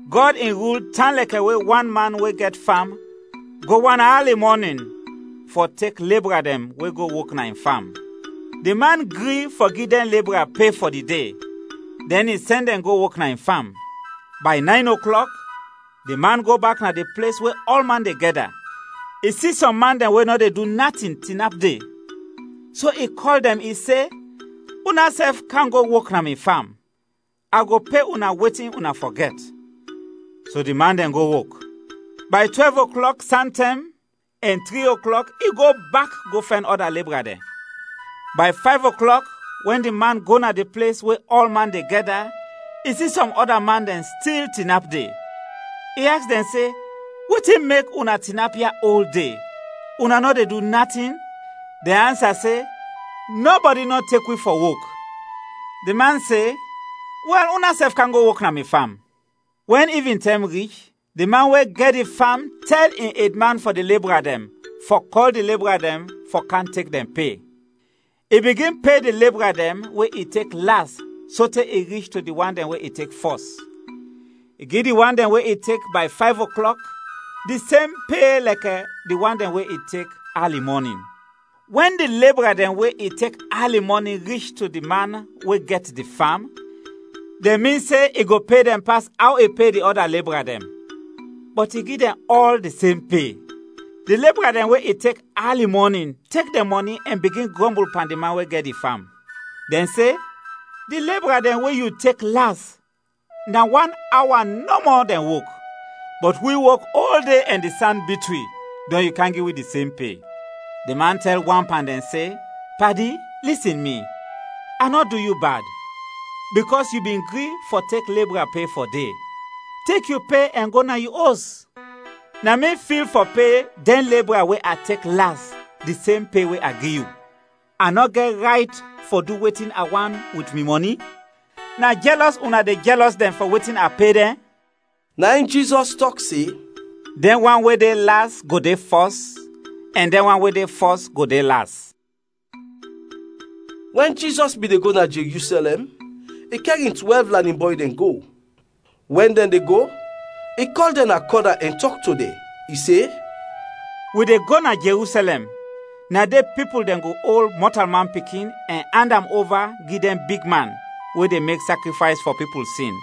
“Gɔd in rul tan lɛkɛ we wan man we gɛt fam go wan ali mɔnin fɔ tek lebra dɛn we go wok na in fam. Di man gri fɔ gi dɛn lebra pe fɔ di de, dɛn i sɛn dɛn go wok na in fam. Bay nayn oklɔk, di man go bak na di ples we ɔlman de gɛda, i si sɔm man dɛn we nɔ de du natin tinap de. So i kɔl dɛn, i se, ‘Unasɛf kam go wok na mi fam, a go pe una wetin una fɔ gɛt.’ So di man dɛn go wok. Bay twɛlv oklɔk santɛm ɛn tri oklɔk i go bak go fɛn ɔda lebra dɛn. Bay fayv oklɔk, wɛn di man go na di ples we ɔlman de gɛda, i si sɔm ɔda man dɛn stil tinap de. I aks dɛn se, ‘Wetin mek una tinap ya ol de, una nɔ de du natin?’ Dɛn ansa se, ‘Nɔbɔdi nɔ tek wi fɔ wok.’ Di man se, ‘Wɛl, unasɛf kam go wok na mi fam.’ “Wɛn ivintɛm rich, di man we gɛt di fam tɛl in edman fɔ di lebra dɛn fɔ kɔl di lebra dɛn fɔ kam tek dɛn pe. I bigin pe di lebra dɛn we i tek las sote i rich to di wan dɛn we i tek fɔs. I gi di wan dɛn we i tek bay fayv oklɔk di sem pe lɛkɛ di wan dɛn we i tek ali mɔnin. Wɛn di lebra dɛn we i tek ali mɔnin rich to di man we gɛt di fam, dɛn min se i go pe dɛn pas aw i pe di ɔda lebra dɛn, bɔt i gi dɛn ɔl di sem pe. Di lebra dɛn we i tek ali mɔnin tek dɛn mɔni ɛn bigin grɔmbul pan di man we gɛt di fam. Dɛn se, ‘Di lebra dɛn we yu tek las, na wan awa nɔmɔ dɛn wok, bɔt wi wok ol de ɛn di san bit wi, dɔn yu kam gi wi di sem pe.’ “Di man tɛl wan pan dɛn se, ‘Padi, lisin mi, a nɔ du yu bad, bikɔs yu bin gri fɔ tek lebra pe fɔ de. Tek yu pe ɛn go na yu os. Na mi fil fɔ pe dɛn lebra we a tek las di sem pe we a gi yu. A nɔ gɛt rayt fɔ du wetin a want wit mi mɔni? Na jɛlɔs una de jɛlɔs dɛn fɔ wetin a pe dɛn?’” Na in Jizɔs tɔk se, “Dɛn wan we de las go de fɔs, ɛn dɛn wan we de fɔs go de las.” Wɛn Jizɔs bin de go na Jerusɛlɛm, i kɛr in twɛlv lanin bɔy dɛn go. Wɛn dɛn de go, i kɔl dɛn na kɔna ɛn tɔk to dɛn. I se, “Wi de go na Jerusɛlɛm, na de pipul dɛn go ol Mɔtalman Pikin ɛn and am ova gi dɛn bigman we de mek sakrifays fɔ pipul sin,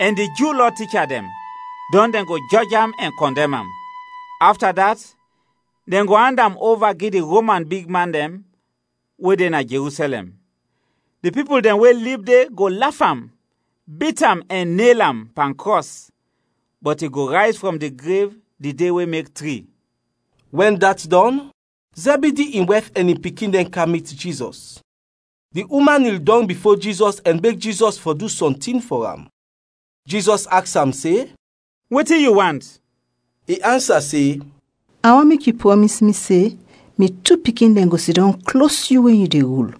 ɛn di Ju Lɔ ticha dɛn, dɔn dɛn go jɔj am ɛn kɔndɛm am. Afta dat, dɛn go and am ova gi di Roman bigman dɛn we de na Jerusɛlɛm. Di pipul dɛn we lib de go laf am, bit am ɛn nel am pan krɔs; bɔt i go rayz frɔm di grev di de we mek tri.” Wɛn dat dɔn, Zɛbidi in wɛf ɛn in pikin dɛn kam mit Jizɔs; di uman nil dɔng bifo Jizɔs ɛn beg Jizɔs fɔ du sɔntin fɔ am. Jizɔs aks am se, “Wetin yu want?” I ansa se, “A want mek yu prɔmis mi se, mi tu pikin dɛn go sidɔm klos yu wɛn yu de rul,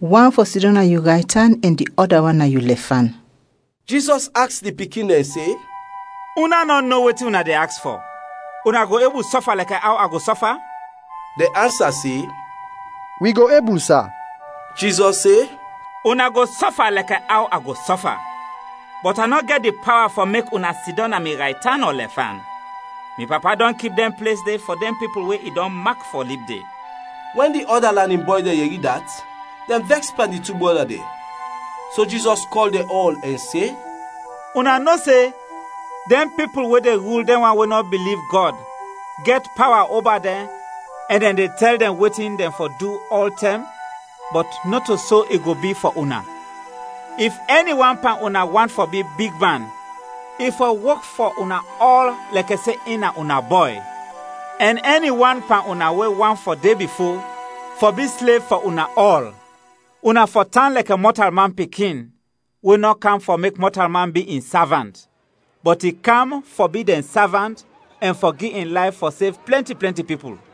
wan fɔ sidɔm na yu raytan ɛn di ɔda wan na yu lɛfan.” Jizɔs aks di pikin dɛn se, “Una nɔ no wetin una de aks fɔ. Una go ebul sɔfa lɛkɛ aw a go sɔfa?” Dɛn ansa se, “Wi go ebul, sa.” Jizɔs se, “Una go sɔfa lɛkɛ aw a go sɔfa, bɔt a nɔ gɛt di pawa fɔ mek una sidɔm na mi raytan ɔ lɛfan, mi Papa dɔn kip dɛn ples de fɔ dɛn pipul we i dɔn mak fɔ lib de.” Wɛn di ɔda lanin bɔy dɛn yɛri dat, dɛn vɛks pan di tu brɔda dɛn. So Jizɔs kɔl dɛn ɔl ɛn se, “Una no se, dɛn pipul we de rul dɛn wan we nɔ biliv Gɔd, gɛt pawa oba dɛn ɛn dɛn de tɛl dɛn wetin dɛn fɔ du ɔltɛm. Bɔt nɔto so i go bi fɔ una. If ɛni wan pan una want fɔ bi bigman, i fɔ wok fɔ una ɔl lɛkɛ se in na una bɔy. Ɛn ɛni wan pan una we want de bifo, fɔ bi slev fɔ una ɔl; una fɔ tan lɛkɛ Mɔtalman Pikin, we nɔ kam fɔ mek mɔtalman bi in savant, bɔt i kam fɔ bi dɛn savant ɛn fɔ gi in layf fɔ sev plɛnti plɛnti pipul.”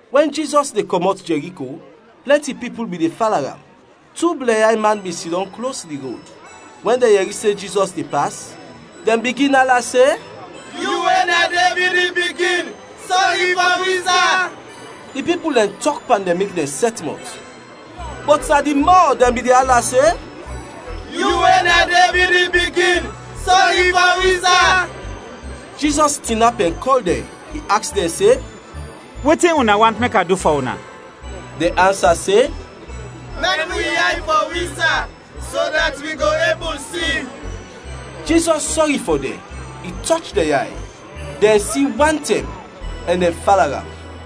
Wɛn Jizɔs de kɔmɔt Jɛriko, plɛnti pipul bin de fala am. Tu blɛnyay man bin sidɔm klos di rod; wɛn dɛn yɛri se Jizɔs de pas, dɛn bigin ala se, “Yu we na Devid in pikin, sɔri fɔ wi, sa!” Di pipul dɛn tɔk pan dɛn mek dɛn sɛt mɔt; bɔt na di mɔ dɛn bin de ala se, “Yu we na Devid in pikin, sɔri fɔ wi, sa!” Jizɔs tinap ɛn kɔl dɛn, i aks dɛn se, “Wetin una want mek a du fɔ una?” Dɛn ansa se, “Mɛn wi yay fɔ wi, sa, so dat wi go ebul si!” Jizɔs sɔri fɔ dɛn, i tɔch dɛn yay; dɛn si wantɛm, ɛn dɛn fala am.